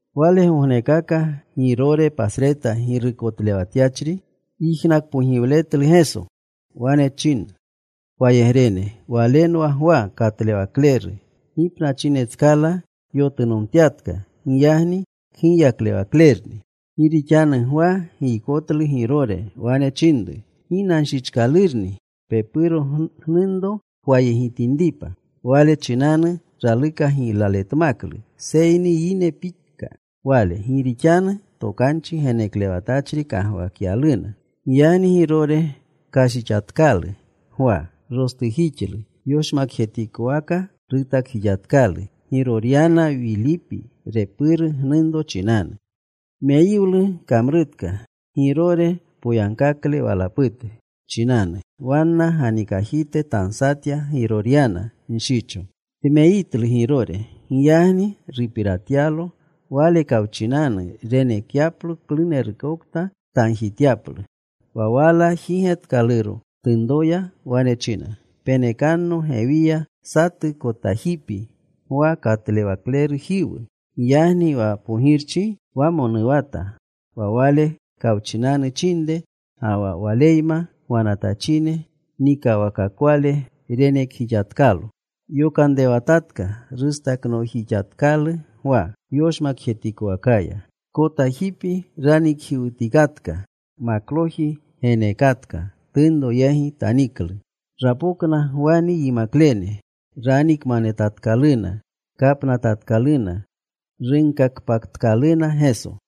Walegognekaka Girore pasreta girukotlewatyachri yijnakpogiwletlu Geso. Wane chinna wayegrene, “Walenwa Gwa Katlewakleru. Gipnachinetskala yotunomtyatka. Giyagni kgiyaklewaklerni.” Gi rixanu Gwa giykotlu Girore. Wane chinru, “Ginanchichkalurni pepuru gnunro pwayegitinripa.” Wale chinanu raluka giylaletmaklu. Seyni yine pika wale, gi rixanu tokanchi geneklewatachri kagwakyaluna. Giyagni Girore kashichjixatkalu Gwa. Rostujixlu. Yoshmakjetikowaka rutakjixatkalu Giroryana, Wilipi repuru gnunro, chinanu. Meyiwlu kamrutka Girore poyagkakle walapute chinanu. Wanna ganikajite tansatya Giroryana nshicho. Tmeyitlu Girore. Giyagni rupiratyalo Wale kawchinanu renekyaplo klunerukokta tagjityaplu. Wa wala jigetkaluro tunroya. Wane china, “Penekanno gewiya satu kotajipi Gwa Katlewaklerujiwu.” Giyagni wa pogirchi wamonuwata. Wa Wale kawchinanu chinre ga wa waleyma gwanatachine nikawakakwale renekjixatkalo. Yokanrewatatka. Rustaknoojixatkalu Gwa yoshmakjetikowakaya. Kotajipi ranikjiwutikatka. Makloji geneekatka. Tunro yegi taniklu. Rapokna Gwani yimaklene. Ranikmanetatkaluna. Kapnatatkaluna. Runkakpatkaluna Geso.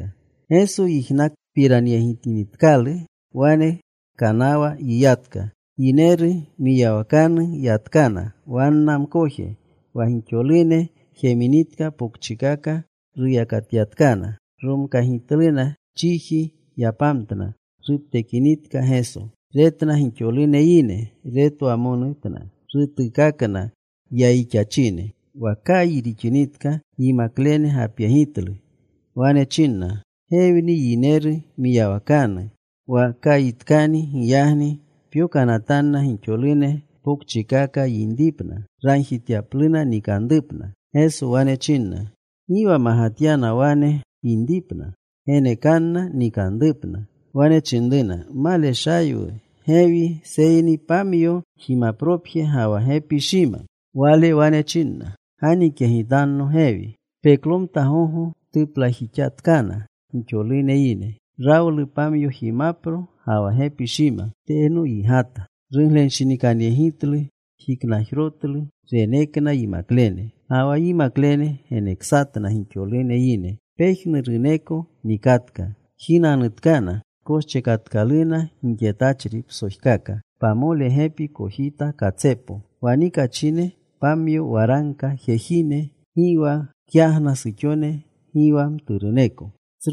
Geso yijnakpiranyegitanatkalu, wane kanawa yiyatka. Yineru mwiyawakanu yatkana wanna mkoje. Wa gixolune jeminitka, pokchikaka ruyakatyatkana. Romkagitluna. Chiji yapamtna. Ruptekinitka Geso, retna gixolune yine. Retwamonutna. Rutuukakna yayixachine. Wa kayi rixinitka yimaklene gapyegitlu. Wane chinna, “Gewni yineru mwiyawakanu. Wa kayitkani. Giyagni pyokanatanna gixolune pokchikaka yinripna, ragjityapluna nikanrupna.” Geso wane chinna, “Gi wa magatyana wane yinripna. Genekanna nikanrupna.” Wane chinruna, “Maleshaywu gewi, seyni pamyo jimapropje ga wa gepi shima.” Wale wane china, “Ganikyegitanno gewi.” Peklomta gogo tuplajixatkana gixolune yine. Rawlu pamyo jimapro ga wa gepi shima. Teno yigata. Ruglenshinikanyegitlu. Jiknajrotlu. Renekna yimaklene. Ga wa yimaklene geneksatna gixolune yine. Pejnuruneko nikatka. Jinanutkana. Koschekatkaluna gixetachri psojkaka, pamole gepi kojita katsepo. Wa nikachine pamyo waragka jejine. Gi wa kyagna suxone. Gi wa mturuneko.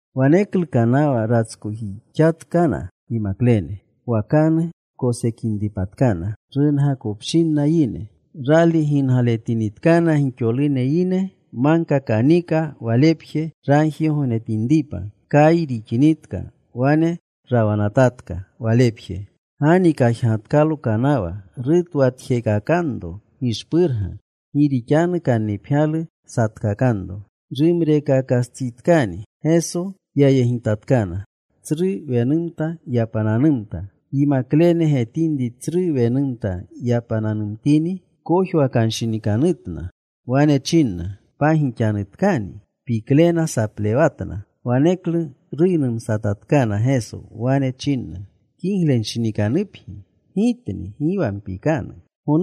Waneklu kanawa ratskojixatkana yimaklene, wakanu kosekinripatkana, rungakopshinna yine. Rali gingaletinitkana gixolune yine, magka kanika Walepje, ragjigognetinripa. Kayi rixinitka wane rawanatatka Walepje. Ganikajgatkalo kanawa. Rutwatjekakanro gishpurga, gi rixanu kannipgyalu satkakanro. Rumrereekastsitkani, Geso yayegitatkana. Tsru wenumta yapananumta. Yimaklene getinri tsru wenumta yapananumtini, kojwakanshinikanutna. Wane chinna, “¡Pagixanutkani!” Piklena saplewatna. Waneklu ruynumatatkana Geso. Wane chinna, “Kiglenshinikanupgi. Gitni. Gi wa mpikanu.”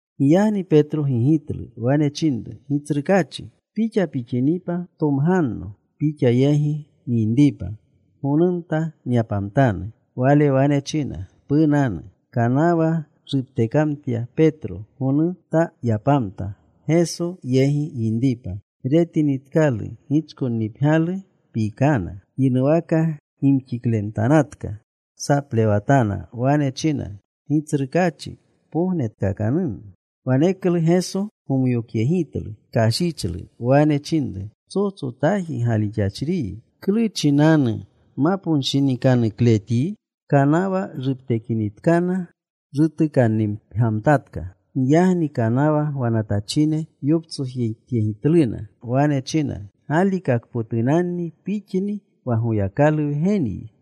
Giyagni Petro gigitlu. Wane chinru, “Gitsrukaachi, Pixa pixinipa ptomganno Pixa yegi nyinripa. Gonumta nyapamtanu.” Wale wane china, “Punanu.” Kanawa ruptekamtya Petro. Gonumta yapamta, Geso yegi yinripa. Retinitkalu gichkonnipgyalu, pikana. Yinuwaka gimxiklemtanatka. Saplewatana. Wane china, “Gitsrukaachi, pognetkakanno.” Waneklu Geso gomyokyegitlu. Kashichlu. Wane chinru, “Psotsotaji galixachriyi. ¿Klu chinanu maponshinikanukletyi?” Kanawa ruptekinitkana, rutukannipgyamtatka. Giyagni kanawa gwanatachine yoptsojityegitluna. Wane chinna, “Galikakpotunanni Pixni wa Goyakalu Wgenyi.”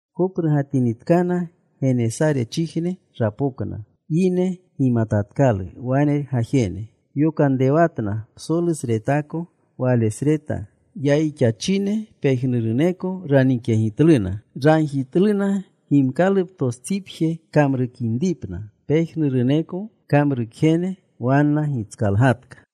Koprugatinitkana, Genesarechijne rapokna. Yine gimatatkalu wane gajene. Yokanrewatna psolusretako walesreta. Yayixachine pejnuruneko ranikyegitluna. Ragjitluna gimkaluptostsipje kamrukinripna. Pejnuruneko kamrukjene wanna gitskalgatka.